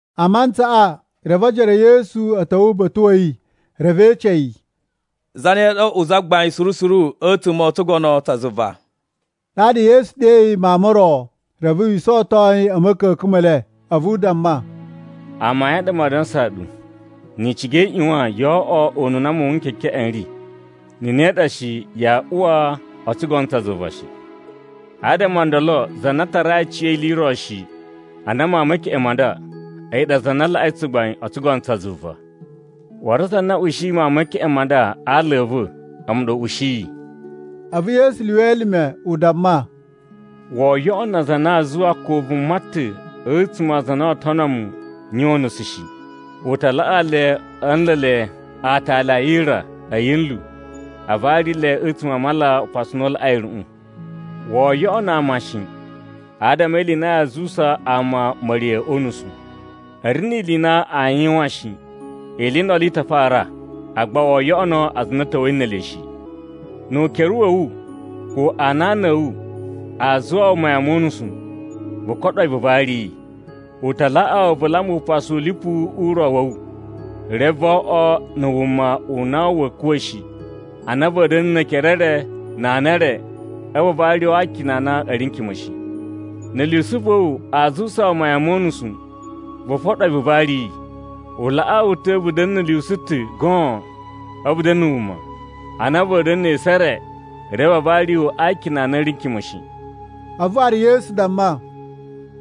A mantsaꞌa, reve ojoro e Yesu a̱ ta̱wa̱ uba̱ta̱ wa̱ yi, reve e ece yi, “Zane ɗa oo oꞌwo zagbain suru suru a̱tsuma̱ o tsugono tsa zuva?” Ɗaɗa Yesu ɗeyi mawun mo ro, reve wi isawaton yi a̱ ma̱ka̱ka̱n me le. A̱vu u damma, “Amayun a ɗa maa dansaa ɗu, ni i ciga i ꞌyuwan yoo oꞌwo ununa muwun n kekeꞌen n ri. Na̱ ne ɗa shi, yaa uwa o tsugono tsa zuva shi. Adama o ndolo za na tarai aciya̱yi ili i ro shi, ana mawun me keꞌen ma nda, a̱yi ɗa za na laꞌai tsugbain o tsugono tsa zuva. “Waru za na ushiyi mawun me keꞌen ma nda a aala a̱ va̱, a̱mu ɗa u ushiyi.” A̱vu Yesu lyuwa elime u damma, “Woo yoꞌono aza a na aa zuwa ko vuma ta̱ a̱tsuma̱ a aza a na oo tono mu yuwan unusu shi. U ta laꞌaa le a̱ nla̱a̱ le aatali a yira a̱ yinlu a vari le a̱tsuma̱ a mala upasu u na u laꞌai a̱ruꞌun! “Woo yoꞌono ama shi, adama e ili i na yaa zuwusa ama ma̱riya̱ o unusu. A̱ ri ni ili i na aa yuwan shi, ili i ndolo i ta fara, agba woo yoꞌono aza a na a̱ ta̱wa̱i ne ele shi! Nu ukere wa̱ wu ko anana a̱ wu aa zuwusa wu mayan mo unusu, vu koɗo yi vu vari yi. U ta laꞌaa wu vu lamba upasu u lipu u ro wa̱ wu, reve vo oꞌwo na̱ wuma u na va̱a̱ kuwa̱ shi a na va̱a̱ da̱na̱ ne ekere e re na ana e re a̱vu a vari wu a akina a na a̱ ri n kima̱ shi. Na̱ lyusu va̱ wu aa zuwusa wu mayan mo unusu, vu foɗo yi vu vari yi. U laꞌaa wu ta̱ vu da̱na̱ na̱ lyusu ta̱ goon a̱vu vu da̱na̱ wuma, a na va̱a̱ da̱na̱ ne esu e re reve a vari wu a akina a na a̱ ri kima̱ shi.” A̱vu waru Yesu damma,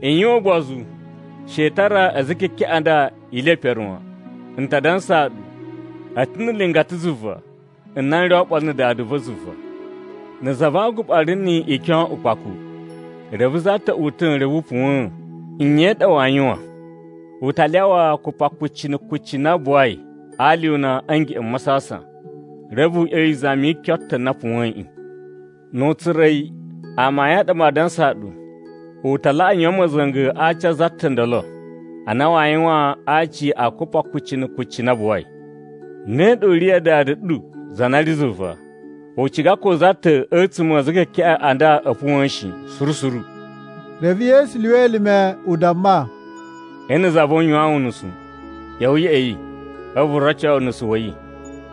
“I yuwan ugbozu. She i tara a̱za̱ e kekeꞌen a nda ili ye pere wan. N ta dansaa ɗu, a̱ ta̱ na̱ nlingata zuva n na n ri oɓolo na̱ Dada va̱ zuva. “Na̱ za va aguɓa ri ni ikyon ukpaku, reve za ta̱ uta̱ reve u puwa̱n, nye i ɗa waa yuwan? U ta lyawa kupakucci na̱ kucci na buwai a alyuna a̱ ngeꞌen m masasan, reve u ꞌya̱wa̱ izami yi kyon ta̱ na puwa̱yiꞌin. Nu u tsura̱ yi, amayun a ɗa maa dansaa ɗu, u ta laꞌa yuwan ma̱za̱nga̱ a aci a̱ za ta̱ o ndolo, a na waa yuwan a aci a kupakucci na̱ kucci na buwai. Ne ɗa u ri ya Dada ɗu za na ri zuva. U ciga ko za ta̱ a̱tsuma̱ a̱ a̱za̱ e kekeꞌen a nda u puwa̱n shi, suru suru.” Reve Yesu lyuwa elime u damma, “Nna̱ za va̱ wu yuwaan wu unusu, ꞌya̱wa̱ ya̱ꞌa̱ yi, a̱vu vu roco yi unusu wa̱ yi.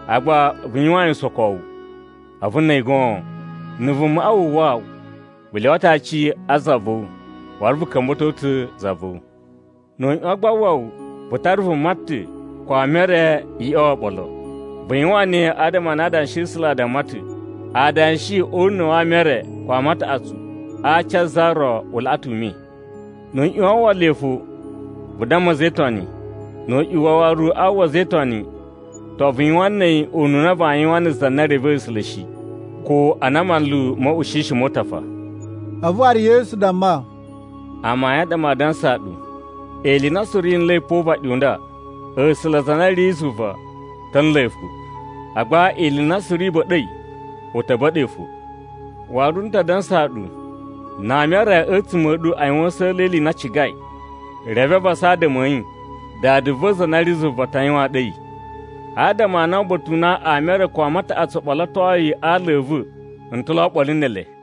Agba vu yuwan yi usokowu, a̱vu na̱ a̱yi goon. Na̱ vumaꞌa wu uwwa wu, vu lyuwa ta̱ aci a za va̱ wu waru vu ka̱mba̱to ta̱ za va̱ wu. Nu u ꞌyuwan gba a uwwa wu, vu tara vuma ta̱, ko ama e re i ꞌya̱wa̱ oɓolo. Vu yuwan ne adama a na Adanshi a̱ A̱sula̱ a damma ta̱ adanshi o una̱ wa ama e re ko ama a taꞌatsu a aci a za ro u laꞌa ta̱ ume. Nu u ꞌyuwan a uwwa le fo, vu damma a̱za̱ e Itoni. Nu u ꞌyuwan waru a uwwa a̱za̱ e Itoni, to, vu yuwan na̱ a̱yi ununa vaa yuwan na̱ za na revei A̱sula̱ shi, ko ana manlu mo uꞌushishi mo utafa.” A̱vu waru Yesu damma, “Amayun a ɗa maa dansaa ɗu, Ili i na suru yi nla̱i pa o uvaɗi u nda, A̱sula̱ za na ri zuva ta̱ a̱ nla̱ yi fo. Agba ili i na suru i ba̱ɗa̱i, u ta̱ ba̱ɗa̱ yi fo. “Waru, n ta dansaa ɗu, na ama e re a̱tsuma̱ a̱ ɗu a yuwan a̱sa̱la̱ e ili i na a cigai, reve a vasa adama a̱ yi, Dada va̱ za na ri zuva ta yuwaan ɗu a̱yi. Adama a na uba̱ta̱ u na ama e re ko ama a taꞌatsu o ɓolotoi a aala a̱ va̱, n ta̱ lo oɓolo ne ele.”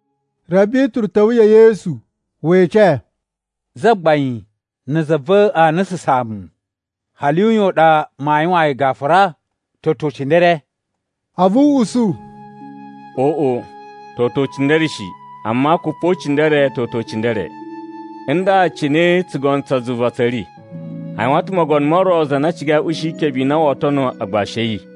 Reve Bituru ta̱wa̱ ya̱ Yesu we ece, “Zagbain, na̱ za va̱ aa nususaan mu, hali uyan u ɗa maa yuwaan yi gafura? Toto ucindere?” A̱vu u usu, “Oꞌo, toto ucindere shi, amma kupocindere toto ucindere. “Nda cine tsugono tsa zuva tsa̱ ri: A yuwan ta̱ mogono mo ro za na cigai u ushi ikebe i na woo tono agbashi a̱ yi.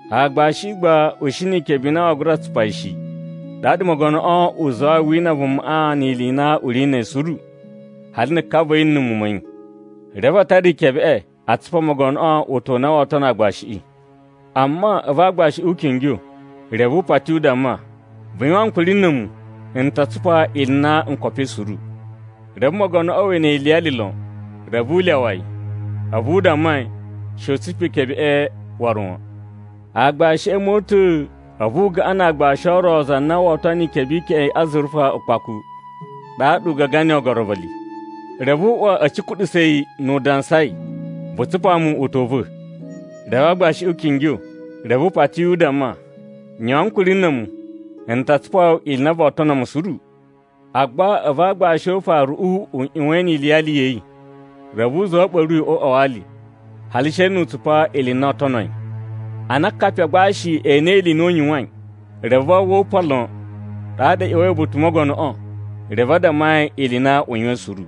Aagbashiꞌi gba u shi ni ikebe i na waa gura tsupa yi shi. Ɗaɗa mogonoꞌo u zuwai a wina vumaꞌa ni ili i na u ri na̱ a̱yi suru, hali na̱ ka va̱ yi na̱ muwun ma̱ yi. Reve a tara ikebeꞌe a tsupa mogonoꞌo utan u na woo tono aagbashiꞌi. “Amma a̱vu aagbashiꞌi u kingyo, reve u pati u damma, ‘Vu yuwan ankuri na̱ a̱mu, n ta tsupa ili i na n kopoi suru.’ Reve mogonoꞌo we ene yi iliyali lon, reve u lyawa yi, a̱vu u damma yi she u tsupa ikebeꞌe waru wan. “Aagbashiꞌi a̱ mota̱a̱, a̱vu u gaꞌan na aagbashi o ro za na woo tono ikebe i keꞌen i azurufa ukpaku. Ɗaɗa u gaga niyi oogorovili. Reve u uwa a̱ cukuɗusa̱ yi nu u dansai, ‘Vu tsupa mu utan u va̱!’ “Reve aagbashiꞌi u kingyo, reve u pati yi u damma, ‘Yuwan ankuri na̱ a̱mu, n ta tsupa wu ili i na voo tono mu suru.’ “Agba a̱vu aagbashi o ufaruꞌu u ꞌyuwan e ene iliyali ya̱ yi. Reve u zuwa a̱ ɓa̱ru yi o uꞌwa wa ali, hali she nu u tsupa ili i na oo tono yi. Ana akapi a agbashi e enei ili i na u yuwain, reve a uwwa upan lon. Ɗaɗa a̱ ꞌya̱wa̱i uba̱ta̱ u mogonoꞌo, reve a damma yi ili i na i yuwain suru.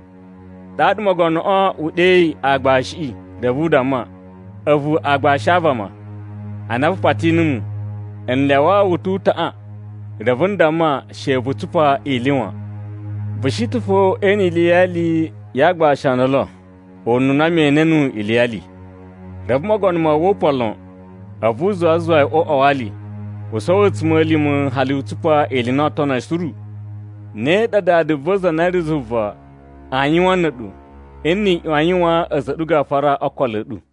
“Ɗaɗa mogonoꞌo u ɗeyi aagbashiꞌi reve u damma, ‘A̱vu aagbashi a vama! Ana vu pati numu, n lyawaa wu ta̱ utaꞌan, reve n damma she vu tsupa ili wan. Vu shi ta̱ fo ee ene iliyali ya aagbashi o ndolo ununa me ene nuwu iliyali.’ Reve mogono ma uwwa upan lon, a̱vu u zuwa a zuwa yi o uꞌwa wa ali, u sowo a̱tsuma̱lima̱ hali u tsupa ili i na oo tono yi suru. “Ne ɗa Dada va̱ za na ri zuva aa yuwan na̱ a̱ɗu nni i ꞌyuwan a yuwaan a̱za̱ a̱ ɗu gafura o okolo a̱ ɗu.”